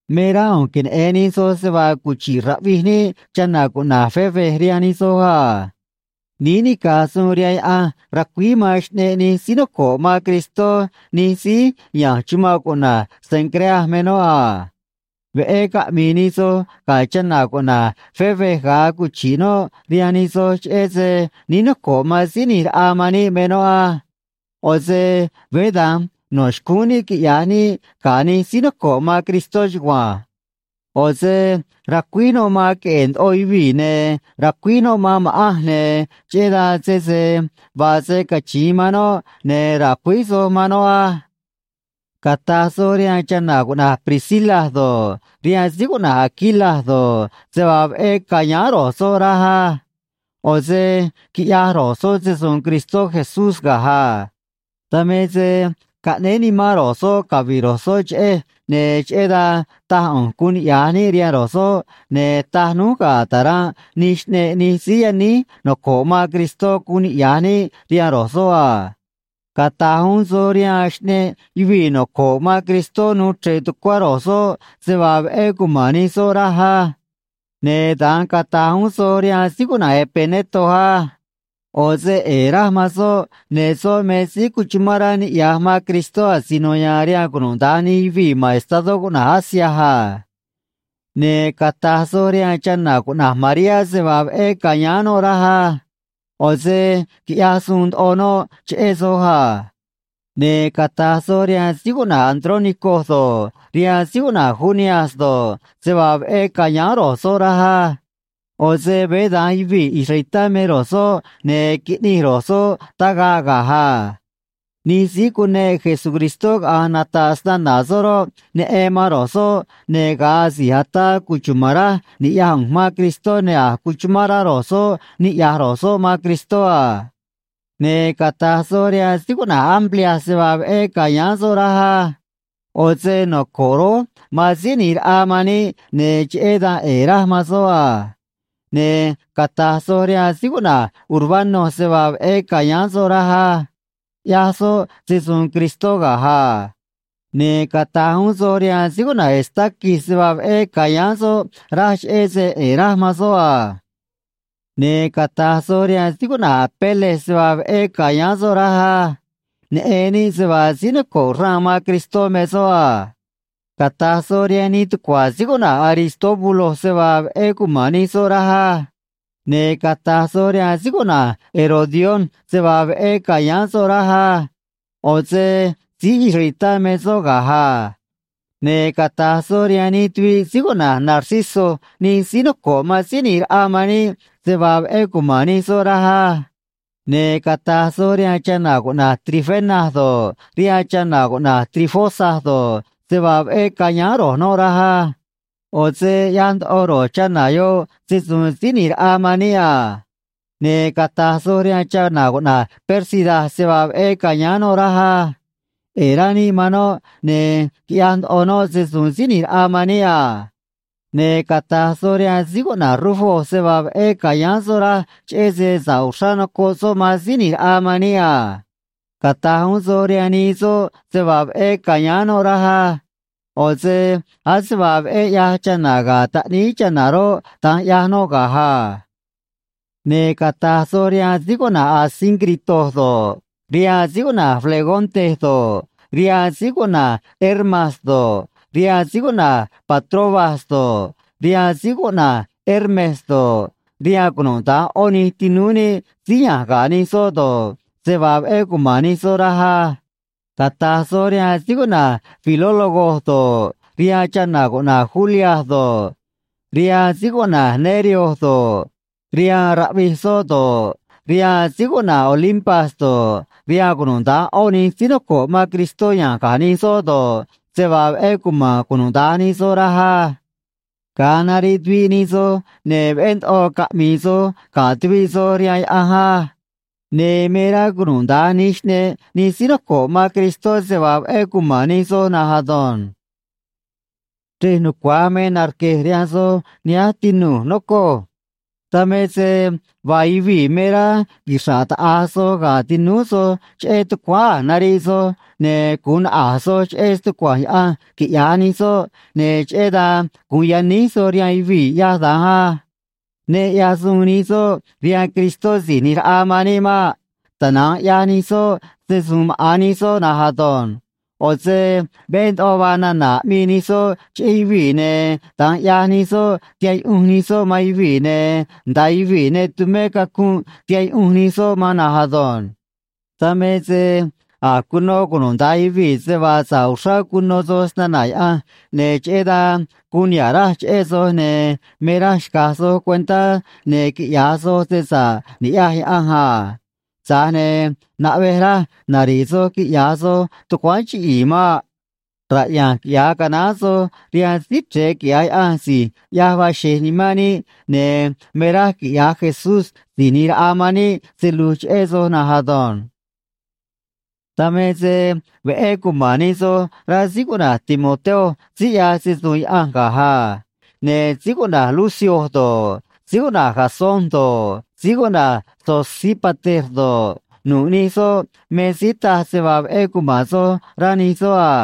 Me rá ꞌu̱nj queneꞌe̱n nij soj se vaa cuchi̱ꞌ raꞌvij níꞌ chana̱ cuꞌna̱j Febe rihaan nij soj a. Níí nica̱j suun rihaan Yaꞌanj ra̱cuíj man xꞌneꞌ nij síí noco̱ꞌ man Cristó nij síí ya̱nj chumanꞌ cuꞌna̱j Cencrea me noꞌ a. Veꞌé caꞌmi̱i̱ nij soj ga̱ chana̱ cuꞌna̱j Febe ga̱a cuchi̱ꞌ noꞌ rihaan nij soj cheꞌé se níí noco̱ꞌ man Síí ꞌNi̱j Raꞌa man níꞌ me noꞌ á. ꞌO̱ se veé da̱nj no̱ xcúún níꞌ quiꞌya̱j níꞌ ga̱ nij síí noco̱ꞌ man Cristó chugua̱nj. ꞌO̱ se racuíj noꞌ man queꞌe̱e̱ ndoꞌo yuvii̱, ne̱ racuíj noꞌ man ma̱ꞌanj, ne̱ cheꞌé dan sese vaa se cachi̱in man noꞌ, ne̱ ra̱cuíj soj man noꞌ á. Cata̱j soj rihaan chana̱ cuꞌna̱j Priscila do̱ꞌ, rihaan síí cuꞌna̱j Aquila do̱ꞌ, se vaa veꞌé ca̱yáán ro̱j soꞌ, raj á. ꞌO̱ se quiꞌyaj ro̱j soꞌ se‑su̱u̱n Cristó Jesús ga̱j a. Dan me se caꞌnéé nimán ro̱j soꞌ cavi̱ꞌ ro̱j soꞌ cheꞌej, ne̱ cheꞌé dan taj ꞌu̱nj guun niꞌya̱j níꞌ rihaan ro̱j soꞌ, ne̱ taj núj ga̱ ta̱ranꞌ nij xꞌneꞌ nij síí yaníj noco̱ꞌ man Cristó guun niꞌya̱j níꞌ rihaan ro̱j soꞌ a. Cata̱j uún soj rihaan xꞌneꞌ yuvii̱ noco̱ꞌ man Cristó nuu chre̱ꞌ tucuá ro̱j soꞌ se vaa veꞌé cuma̱n nij soꞌ, raj á. Ne̱ da̱nj cata̱j uún soj rihaan síí cuꞌna̱j Epeneto á. ꞌO̱ se ꞌe̱e̱ raj man soꞌ, ne̱ soꞌ me síí cuchumán rá niꞌya̱j man Cristó asino ya̱a̱n rihaan cunuda̱nj nij yuvii̱ ma̱n estadó cuꞌna̱j Asia a. Ne̱ cata̱j soj rihaan chana̱ cuꞌna̱j Mariá se vaa veꞌé ca̱yáán noꞌ raj á. ꞌO̱ se quiꞌyaj suun ndoꞌo noꞌ cheꞌé soj a. Ne̱ cata̱j soj rihaan síí cuꞌna̱j Andrónico do̱ꞌ, rihaan síí cuꞌna̱j Junias do̱ꞌ, se vaa veꞌé ca̱yáán ro̱j soꞌ, raj á. ꞌO̱ se veé da̱nj yuvii̱ israelitá me ro̱j soꞌ, ne̱ quiꞌnij ro̱j soꞌ tagaꞌ ga̱j a. Nij síí cuneꞌ Jesucristó caꞌa̱nj nata̱ꞌ snana̱ soꞌ roꞌ, neꞌen man ro̱j soꞌ, ne̱ ga̱a asi̱j ataa cuchuma̱n raj ni̱ꞌyaj ꞌu̱nj man Cristó, ne̱ a̱j cuchumán rá ro̱j soꞌ niꞌya̱j ro̱j soꞌ man Cristó a. Ne̱ cata̱j soj rihaan síí cuꞌna̱j Amplias se vaa veꞌé ca̱yáán soꞌ, raj á. ꞌO̱ se noco̱ꞌ rój man Síí ꞌNi̱j Raꞌa man níꞌ, ne̱ cheꞌé dan ꞌe̱e̱ raj man soꞌ a. Ne̱ cata̱j soj rihaan síí cuꞌna̱j Urbano se vaa veꞌé ca̱yáán soꞌ, raj á. ꞌYaj soꞌ se‑su̱u̱n Cristó ga̱j a. Ne̱ cata̱j uún soj rihaan síí cuꞌna̱j Estaquis se vaa veꞌé ca̱yáán soꞌ, raj, cheꞌé se ꞌe̱e̱ raj man soꞌ a. Ne̱ cata̱j soj rihaan síí cuꞌna̱j Apeles se vaa veꞌé ca̱yáán soꞌ, raj á. Neꞌen níꞌ se vaa síí noco̱ꞌ xraan man Cristó me soꞌ a. Cata̱j soj rihaan nij tucua̱ síí cuꞌna̱j Aristóbulo se vaa veꞌé cuma̱n nij soꞌ, raj á. Ne̱ cata̱j soj rihaan síí cuꞌna̱j Herodión se vaa veꞌé ca̱yáán soꞌ, raj á. ꞌO̱ se síí israelitá me soꞌ ga̱j a. Ne̱ cata̱j soj rihaan nij tuviꞌ síí cuꞌna̱j Narciso nij síí noco̱ꞌ man Síí ꞌNi̱j Raꞌa man níꞌ se vaa veꞌé cuma̱n nij soꞌ, raj á. Ne̱ cata̱j soj rihaan chana̱ cuꞌna̱j Trifena do̱ꞌ, rihaan chana̱ cuꞌna̱j Trifosa do̱ꞌ, se vaa veꞌé ca̱yáán ro̱j noꞌ, raj á. ꞌO̱ se ꞌyaj ndoꞌo ro̱j chana̱ yoꞌ se‑su̱u̱n Síí ꞌNi̱j Raꞌa man níꞌ a. Ne̱ cata̱j soj rihaan chana̱ cuꞌna̱j Pérsida se vaa veꞌé ca̱yáán noꞌ, raj á. ꞌE̱e̱ rá níꞌ man noꞌ, ne̱ quiꞌyaj ndoꞌo noꞌ se‑su̱u̱n Síí ꞌNi̱j Raꞌa man níꞌ a. Ne̱ cata̱j soj rihaan síí cuꞌna̱j Rufo se vaa veꞌé ca̱yáán soꞌ, raj, cheꞌé se sa̱ꞌ uxrá nocoꞌ soꞌ man Síí ꞌNi̱j Raꞌa man níꞌ a. Cata̱j uún soj rihaan nii soꞌ se vaa veꞌé ca̱yáán noꞌ, raj á. ꞌO̱ se ase vaa veꞌé ꞌyaj chana̱ ga̱ taꞌníí chana̱ roꞌ, da̱nj ꞌyaj noꞌ ga̱j a. Ne̱ cata̱j soj rihaan síí cuꞌna̱j Asíncrito do̱ꞌ, rihaan síí cuꞌna̱j Flegonte do̱ꞌ, rihaan síí cuꞌna̱j Hermas do̱ꞌ, rihaan síí cuꞌna̱j Patrobas do̱ꞌ, rihaan síí cuꞌna̱j Hermes do̱ꞌ, rihaan cunuda̱nj ꞌó nij tinúú níꞌ síí ya̱nj ga̱ nij soꞌ do̱ꞌ, se vaa veꞌé cuma̱n nij soꞌ raj á. Cata̱j soj rihaan síí cuꞌna̱j Filólogo do̱ꞌ, rihaan chana̱ cuꞌna̱j Julia do̱ꞌ, rihaan síí cuꞌna̱j Nereo do̱ꞌ, rihaan raꞌvij soꞌ do̱ꞌ, rihaan síí cuꞌna̱j Olimpas do̱ꞌ, rihaan cunuda̱nj ꞌó nij síí noco̱ꞌ man Cristó ya̱nj ga̱ nij soꞌ do̱ꞌ, se vaa veꞌé cuma̱n cunuda̱nj nij soꞌ, raj á. Ga̱a nariꞌ tuviꞌ nij soj, ne̱ veꞌé ndoꞌo caꞌmi̱i̱ soj ga̱ tuviꞌ soj rihaan Yaꞌanj á. Ne̱ me rá cunuda̱nj nij xꞌneꞌ nij síí noco̱ꞌ man Cristó se vaa veꞌé cuma̱n nij soj na̱nj ado̱nj. Chrej nucua̱j me narque̱j rihaan soj nihánj, tinu̱j, nocoj. Dan me se vaa yuvii̱ me rá quixra̱ꞌ taꞌa̱j soj ga̱ tinúú soj cheꞌé tucuáán a̱j nariꞌ soj, ne̱ gu̱un naꞌa̱j soj cheꞌé stucua̱nj Yaꞌanj, quiꞌya̱j nij soꞌ, ne̱ cheꞌé dan gu̱un yaníj soj rihaan yuvii̱ ꞌyaj da̱nj á. Ne ꞌyaj suun nij soꞌ rihaan Cristó Si̱j ꞌNi̱j Raꞌa man níꞌ maꞌ. Tana̱nj ꞌyaj nij soꞌ se‑su̱u̱n maꞌa̱n nij soꞌ na̱nj ado̱nj. ꞌO̱ se veꞌé ndoꞌo vaa nana̱ aꞌmii nij soꞌ cheꞌé yuvii̱, ne̱ da̱nj ꞌyaj nij soꞌ tihaꞌ yuꞌunj nij soꞌ man yuvii̱, ne̱ nda̱a yuvii̱ ne tumé cacunꞌ tihaꞌ yuꞌunj nij soꞌ man na̱nj ado̱nj. Dan me se a̱j cuno cunuda̱nj yuvii̱ se vaa sa̱ꞌ uxrá cuno soj snana̱ Yaꞌanj, ne̱ cheꞌé dan guun niha̱ꞌ raj cheꞌé soj, ne̱ me raj xca̱j soj cuentá, ne̱ quiꞌya̱j soj se sa̱ꞌ ni̱ꞌyaj Yaꞌanj a. Tza̱j ne̱ naꞌvej raj nari̱ꞌ soj quiꞌya̱j soj tucuáán chiꞌi̱i̱ maꞌ. Raꞌya̱nj quiꞌya̱j canaán soj rihaan Síí Chre̱e, quiꞌya̱j Yaꞌanj, si̱j ꞌyaj vaa xe̱j nimán níꞌ, ne̱ me raj quiꞌya̱j Jesús Si̱j ꞌNi̱j Raꞌa man níꞌ se lu̱j cheꞌé soj na̱nj ado̱nj. Dan me se veꞌé cuma̱n nij soj, rá síí cuꞌna̱j Timoteo síí ꞌyaj se‑su̱u̱n Yaꞌanj ga̱j a. Ne̱ síí cuꞌna̱j Lucio do̱ꞌ, síí cuꞌna̱j Jasón do̱ꞌ, síí cuꞌna̱j Sosípater do̱ꞌ, nu̱ꞌ nij soꞌ me síí taj se vaa veꞌé cuma̱n soj, rá nij soꞌ a.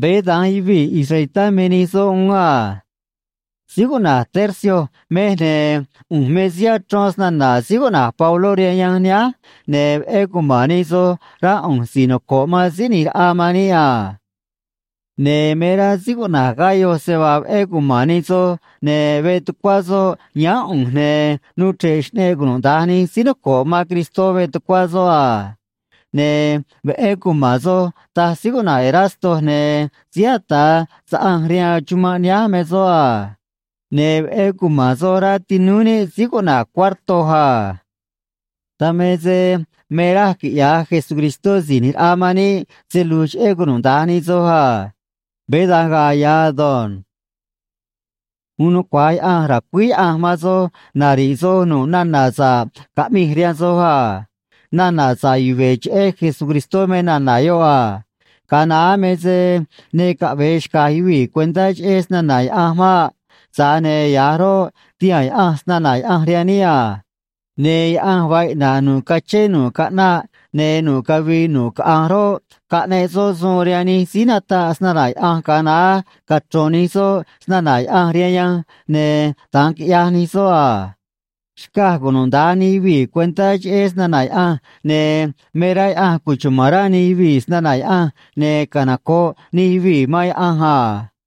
Veé da̱nj yuvii̱ israelitá me nij soꞌ uún a. Síí cuꞌna̱j Tercio mej, ne̱ ꞌu̱nj me síí achrón snana̱ síí cuꞌna̱j Pabló rihaan yanj nihánj, ne̱ veꞌé cuma̱n nij soj, rá ꞌu̱nj si̱j noco̱ꞌ man Síí ꞌNi̱j Raꞌa man níꞌ a. Ne̱ me rá síí cuꞌna̱j Gayo se vaa veꞌé cuma̱n nij soj, ne̱ veꞌ tucuá soꞌ yáán ꞌu̱nj, ne̱ nuu chre̱ꞌ xꞌneꞌ cunuda̱nj nij síí noco̱ꞌ man Cristó veꞌ tucuá soꞌ a. Ne̱ veꞌé cuma̱n soj, taj síí cuꞌna̱j Erasto, ne̱ síí ata̱ saꞌanj rihaan chumanꞌ nihánj me soꞌ a. Ne̱ veꞌé cuma̱n soj, rá tinúú níꞌ síí cuꞌna̱j Cuarto a. Dan me se me raj quiꞌya̱j Jesucristó Si̱j ꞌNi̱j Raꞌa man níꞌ se lu̱j cheꞌé cunuda̱nj nij soj a. Veé da̱nj ga̱a̱ ya̱ ado̱nj. Uun nucua̱j Yaꞌanj ra̱cuíj Yaꞌanj man soj nari̱ꞌ soj nu̱ꞌ nana̱ sa̱ꞌ caꞌmij rihaan soj a. Nana̱ sa̱ꞌ yuve̱ cheꞌé Jesucristó me nana̱ yoꞌ a. Ga̱a naá me se ne caꞌve̱e xca̱j yuvii̱ cuentá cheꞌé snana̱ Yaꞌanj maꞌ. Tza̱j ne̱ ya̱j roꞌ, tihaa̱n Yaꞌanj snana̱ Yaꞌanj rihaan níꞌ a. Ne̱ Yaꞌanj vaa iꞌna̱ꞌ nu̱ꞌ cachén nu̱ꞌ caꞌnaꞌ ne̱ nu̱ꞌ cavii nu̱ꞌ caꞌanj roꞌ, caꞌneꞌ soꞌ suun rihaan nij síí nataꞌ snana̱ Yaꞌanj ga̱a naá, cachro̱n nij soꞌ snana̱ Yaꞌanj rihaan yanj, ne̱ da̱nj quiꞌyaj nij soꞌ a. Xcaj cunuda̱nj nij yuvii̱ cuentá cheꞌé snana̱ Yaꞌanj, ne̱ me rá Yaꞌanj cuchuma̱n rá nij yuvii̱ snana̱ Yaꞌanj, ne̱ canoco̱ꞌ nij yuvii̱ man Yaꞌanj a.